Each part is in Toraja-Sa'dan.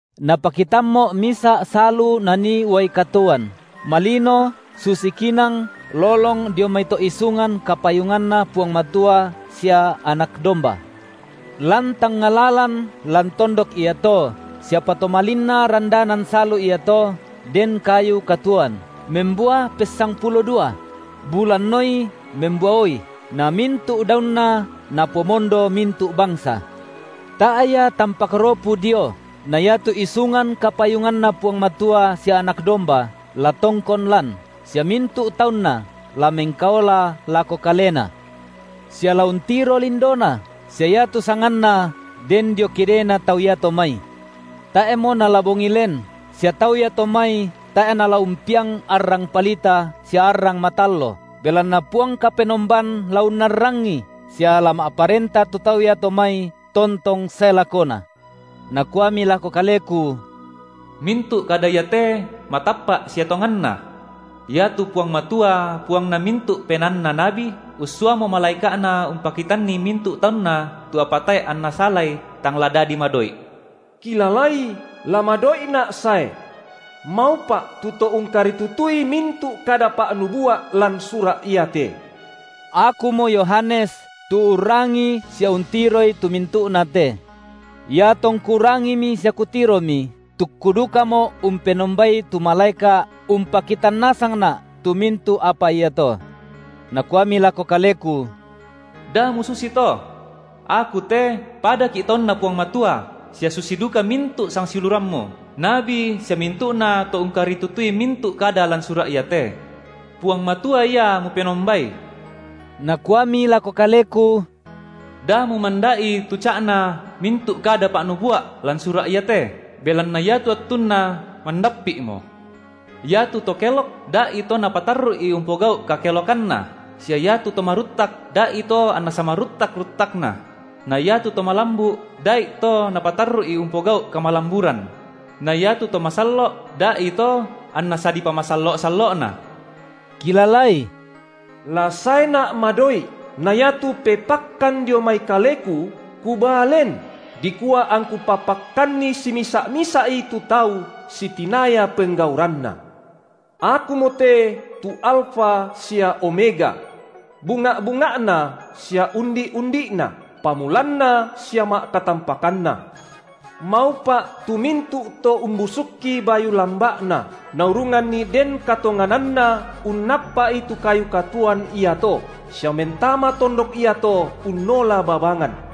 Napakitammo’ misa’ salu nanii uai katuoan, malino susi kinang lolong dio mai to’ isungan kapayunganNa Puang Matua sia Anak domba. Lan tangnga lalan lan tondok iato sia patomalinna randanan salu iato den kayu katuoan, membua pessangpulo dua; bulanoi membuaoi, namintu’ daunna napomondo mintu’ bangsa. Tae’ ia tampak ropu dio; na iatu isungan kapayunganNa Puang Matua sia Anak domba la tongkon lan, sia mintu’ taunNa la mengkaola lako Kalena, sia la untiro lindoNa, sia iatu sanganNa den dio kidena tau iato mai. Tae’mo nala bongi len, sia tau iato mai tae’ nala umpiang arrang palita sia arrang matallo, belanna Puang Kapenomban la unnarrangi, sia la ma’parenta tu tau iato mai tontong sae lakona. Nakuami lako kaleku: Mintu’ kada iate matappa’ sia tonganna. Iatu Puang Matua, Puangna mintu’ penaanna nabi, ussuamo malaeka’Na umpakitanni mintu’ taunNa tu apa tae’ anna salai tang la dadi madoi’. Kilalai, la madoi’Na’ sae. Maupa’ tu to ungkaritutui mintu’ kada pa’nubua’ lan sura’ iate. Akumo Yohanes tu urrangii sia untiroi tu mintu’na te. Iatongku rangimi sia kutiromi, tukku dukamo’ umpenombai tu malaeka’ umpakitan nasangna’ tu mintu’ apa iato. Nakuami lako kaleku: Da mususi to. Aku te padaki’ taunNa Puang Matua, sia susi duka mintu’ sangsiulurammu, nabi sia mintu’nato ungkaritutui mintu’ kada lan sura’ iate. Puang Matua Ia mupenombai. Nakuami lako kaleku: Da mumanda’i tu ca’na mintu’ kada pa’nubua’ lan sura’ iate, belanna iatu attunna mandappi’mo. Iatu to kelok, da’ito napatarru’i umpogau’ kakelokanna, sia iatu to maruttak, da’ito anna samaruttak-ruttakna; na iatu to malambu’, dai’to napatarru’i umpogau’ kamalamburan; na iatu to masallo’ da’ito anna sadipamasallo’-sallo’na. Kilalai, la saeNa’ madoi’, na iatu pepakkan dio mai Kaleku Kubaa len, dikua angKu papakkanni simisa’-misa’i tu tau sitinaya penggauranna. Akumote tu Alfa sia Omega. Bunga’-bunga’na sia Undi’-undi’na, Pamulanna sia Ma’katampakanna. Maupa’ tu mintu’ to umbusukki bayu lamba’na, naurunganni den katongananna unnappa’i tu kayu katuoan iato, sia mentama tondok iato unnola babangan.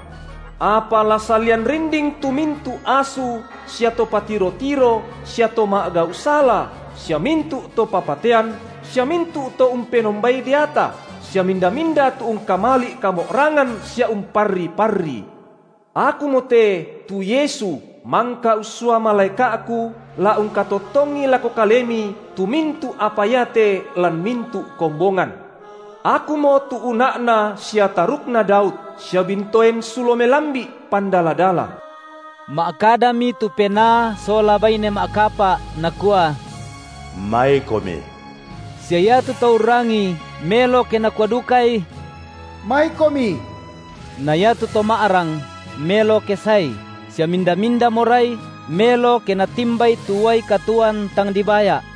Apa la salian rinding tu mintu’ asu sia to patiro-tiro sia to ma’gau’ sala, sia mintu’ to papatean, sia mintu’ to umpenombai deata, sia minda-minda tu ungkamali’ kamo’rangan sia umparri-parrii. Akumote tu Yesu mangka ussua malaeka’Ku la ungkatottongi lako kalemi tu mintu’ apa iate lan mintu’ kombongan. Akumo tu una’na sia tarukna Daud, sia bintoen sulo melambi’ pandala-dala. Ma’kadami tu penaa sola baine ma’kapa’ nakua: MaiKomi! Sia iatu to urrangii, melo ke nakua dukai: MaiKomi! Na iatu to ma’rang, melo ke saei, sia minda-minda morai, melo ke natimbai tu uai katuoan tang dibaya’.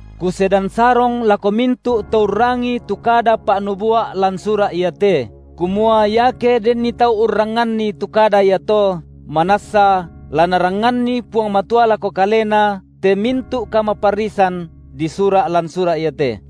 Kusedan sarong lako mintu’ to urrangii tu kada pa’nubua’ lan sura’ iate, kumua iake denni tau urrangnganni tu kada iato, manassa la Narangnganni Puang Matua lako kalena te mintu’ kamaparrisan disura’ lan sura’ iate;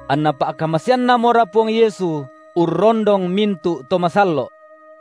Anna pa’kamaseanNamora Puang Yesu urrondong mintu’ to masallo’.